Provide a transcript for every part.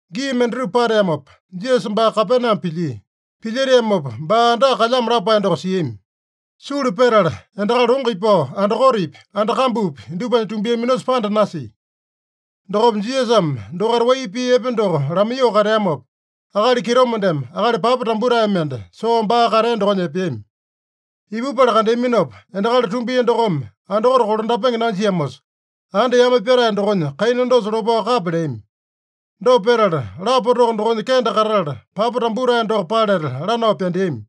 Gii mendatupa pateamopa, Jisasa baa Kapename pilyia. Pilyeteamopa baa andaka kalyamo lapae doko siami. Sulu petala endakali longo ipao, andakotepi, anda kambupi dupanya tumbiaminosa panda nasia. Dokopa Jisasame dokaita wai pii epe doko lamaiyoo kateamopa, akali kitomendeme akali papa tambutae mende soo baa katea dokonya epeami. Ipupala kandeaminopa, endakali tumbia dokome andakote kolandapenge nanjiamosa, anda yame pyatae dokonya kaina dosa lopao kapya leami. Dopa petala, lapa toko dokonya kende katatala, papa tambutae doko paleta lanao pyandeami.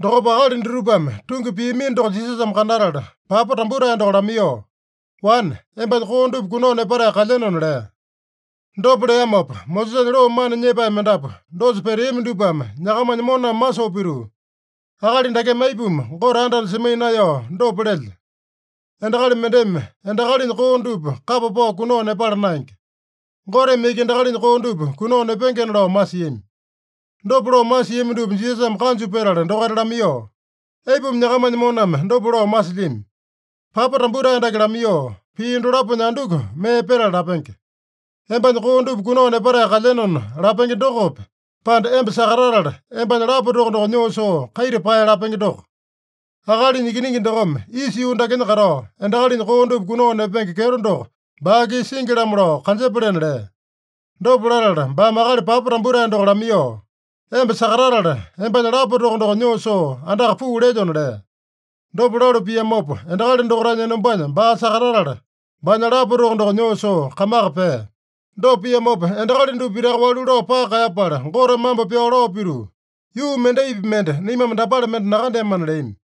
Dokopa akali dutupame tungi piamino doko Jisasame kandatala, papa tambutae doko lamaiyoo, “Wane, embanya koo dupa kunao nepatae kalyenona” lea. Dopa leamopa, Mosesanya loo mana nyepae mendapu dosa peteami dupame nyakamanya moname masoo pituu, “Akali dakeme aipuma Gote anda-anda semaiya naeyao dopa lelya? Endakali mendeme endakalinya koo dupa kapa pao kunao nepala naenge. Goteme iki endakalinya koo dupa kunao nepengena” lao masiami. Dopa lao masiami dupa Jisasame kanju petala dokaita lamaiyoo, “Aipuma nyakamanya moname dopa lao masilyami? Papa tambutae dake lamaiyoo, pii dalaponya anduku mee petala lapenge? ‘Embanya koo dupa kunao nepatae kalyenona’ lapenge dokope, pande, ‘Emba sakatatala, embanya lapa toko doko nyoo soo kaita pae’ lapenge doko? Akalinya Ikiningi dokome isa yuu dakenya katao, endakalinya koo dupa kunao nepenge kyeto doko baa-kisa singi-lamo lao kanjepalena” lea. Dopa latala baame akali papa tambutae doko lamaiyoo, “Emba sakatatala, embanya lapa toko doko nyoo soo andaka puu lelyona” lea. Dopa lalu piamopa, endakali dokaitanya enombanya baa sakatatala, baanya lapa toko doko nyoo soo kamaka pea. Dopa piamopa, endakali dupa pitaka walu lao paka kaeyapala, Gote mambo pyao lao pituu, “Yuu mendaipi mende naimame dapale mende nakandeamana” leami.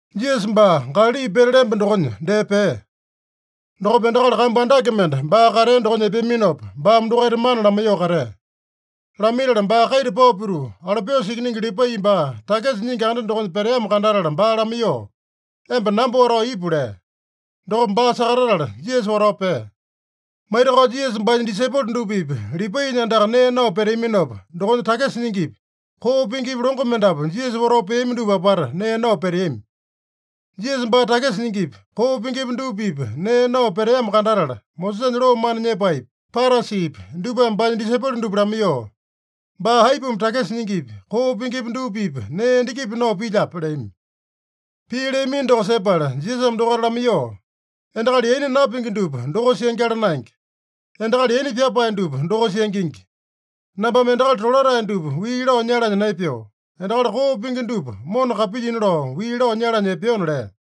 Jisasa baa Galali pete lemba dokonya dee pea. Dokopa endakali kambu andake mende baa katea dokonya epeaminopa, baame dokaita mana lamaiyoo katea. Lamaitala baa kaita pao pituu, Alopiusa ikiningi Lipai baa takisa nyingi anda dokonya peteamo kandatala baa lamaiyoo, “Emba namba watao ipu” lea. Dokopa baa sakatatala Jisasa watao pea. Maitakao Jisasa baanya disaipolo dupa-pipa Lipainya andaka nee nao peteaminopa, dokonya takisa nyingipi, koo pingipi longo mendapu Jisasa watao peami dupa apata nee nao peteami. Jisasa baa takisa nyingipi, koo pingipi dupa-pipa nee nao peteamo kandatala, Mosesanya loo mana nyepaepi, Parasipi dupame baanya disaipolo dupa lamaiyoo, “Baa aipuma takisa nyingipi, koo pingipi dupa-pipa nee endakipi nao pilyape?” leami. Pii leamino doko sepala Jisasame dokaita lamaiyoo, “Endakali yaina napingi dupa dokosa yangyala naenge. Endakali yaina pyapae dupa dokosa yangingi. Nambame endakali tolatae dupa wii lao nyalanya naepeo. Endakali koo pingi dupa mona kapilyina lao, wii lao nyalanya epeona” lea.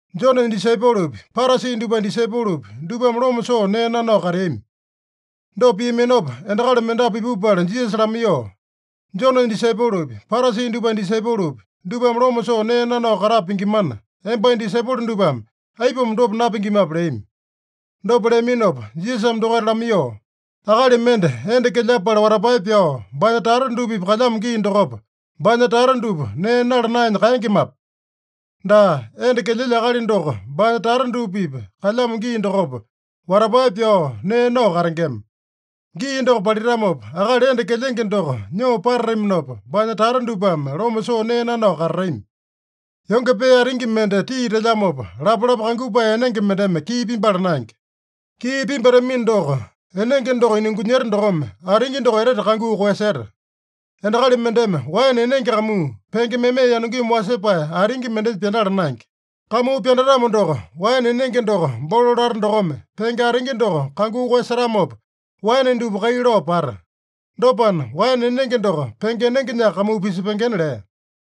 Jonenya disaipolopi, Parasi dupanya disaipolopi, dupame loma soo nee nanao kateami. Dopa piaminopa, endakali mendapu ipupala Jisasa lamaiyoo, “Jonenya disaipolopi, Parasi dupanya disaipolopi, dupame loma soo nee nanao katapa pingimana, embanya disaipolo dupame aipuma dopa napingimape?” leami. Dopa leaminopa Jisasame dokaita lamaiyoo, “Akali mende enda kelyapala watapae pyao, baanya tata dupa-pipa kalyamo gii dokopa, baanya tata dupa nee nala naenya kaengemape? Daa, enda kelyelya akali doko baanya tata dupa-pipa kalyamo gii dokopa, watapae pyao nee nao katengema. Gii doko palitamopa, akali enda kelyenge doko nyoo patataminopa, baanya tata dupame loma soo nee nanao katatami. “Yonge pee atingi mende tii telyamopa, lapalapa kangupae enenge mendeme kii pimbala naenge. Kii pimbatamino doko, enenge doko inungunyeta dokome, atingi doko etete kanguu koeyaseta. Endakali mendeme waene enenge kamuu, penge meme yanungimi wasepae atingi mendenya pyandala naenge. Kamuu pyandatamo doko, waene enenge doko bolo lata dokome, penge atingi doko kanguu koeyasetamopa, waene dupa kai lao pata. Dopana, waene enenge doko penge enengenyaka kamuu pisepengena” lea.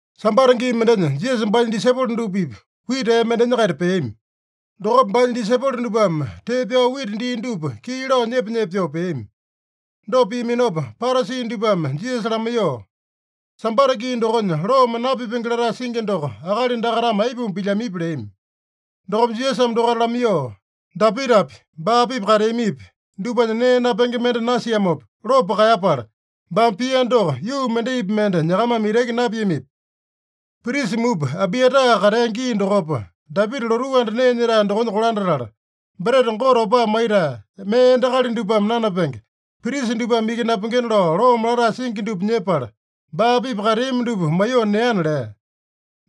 Sambata gii mendenya Jisasa baanya disaipolo dupa-pipa wita ee mendenya-kaita peami. Dokopa baanya disaipolo dupame tee pyao wita dii dupa kii lao nyepa-nyepa pyoo peami. Dopa piaminopa Parasi dupame Jisasa lamaiyoo, “Sambata gii dokonya loome napipenge latae singi doko akali dakaitame aipuma pilyamipi?” leami. Dokopa Jisasame dokaita lamaiyoo, “Dapitapi, baa-pipa kateamipi, dupanya nee napenge mende nasiamopa lopo kaeyapala, baame pia doko yuu mendaipi mende nyakamame itaki napiamipi? Prisa mupa Abiata katea gii dokopa, Dapita lotuu anda nee nyetae dokonya kolandatala, breta Gote opaa maitae, mee endakali dupame nanapenge, prisa dupame iki napengena lao loome latae singi dupa nyepala, baa-pipa kateami dupa maiyoo neana” lea.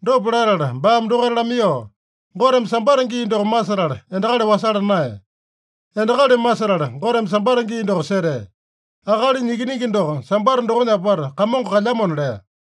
Dopa latala baame dokaita lamaiyoo, “Goteme Sambata gii doko masetala endakali wasala naeya. Endakali masetala Goteme Sambata gii doko setea. Akalinya Ikiningi doko Sambata dokonya apata Kamongo kalyamona” lea.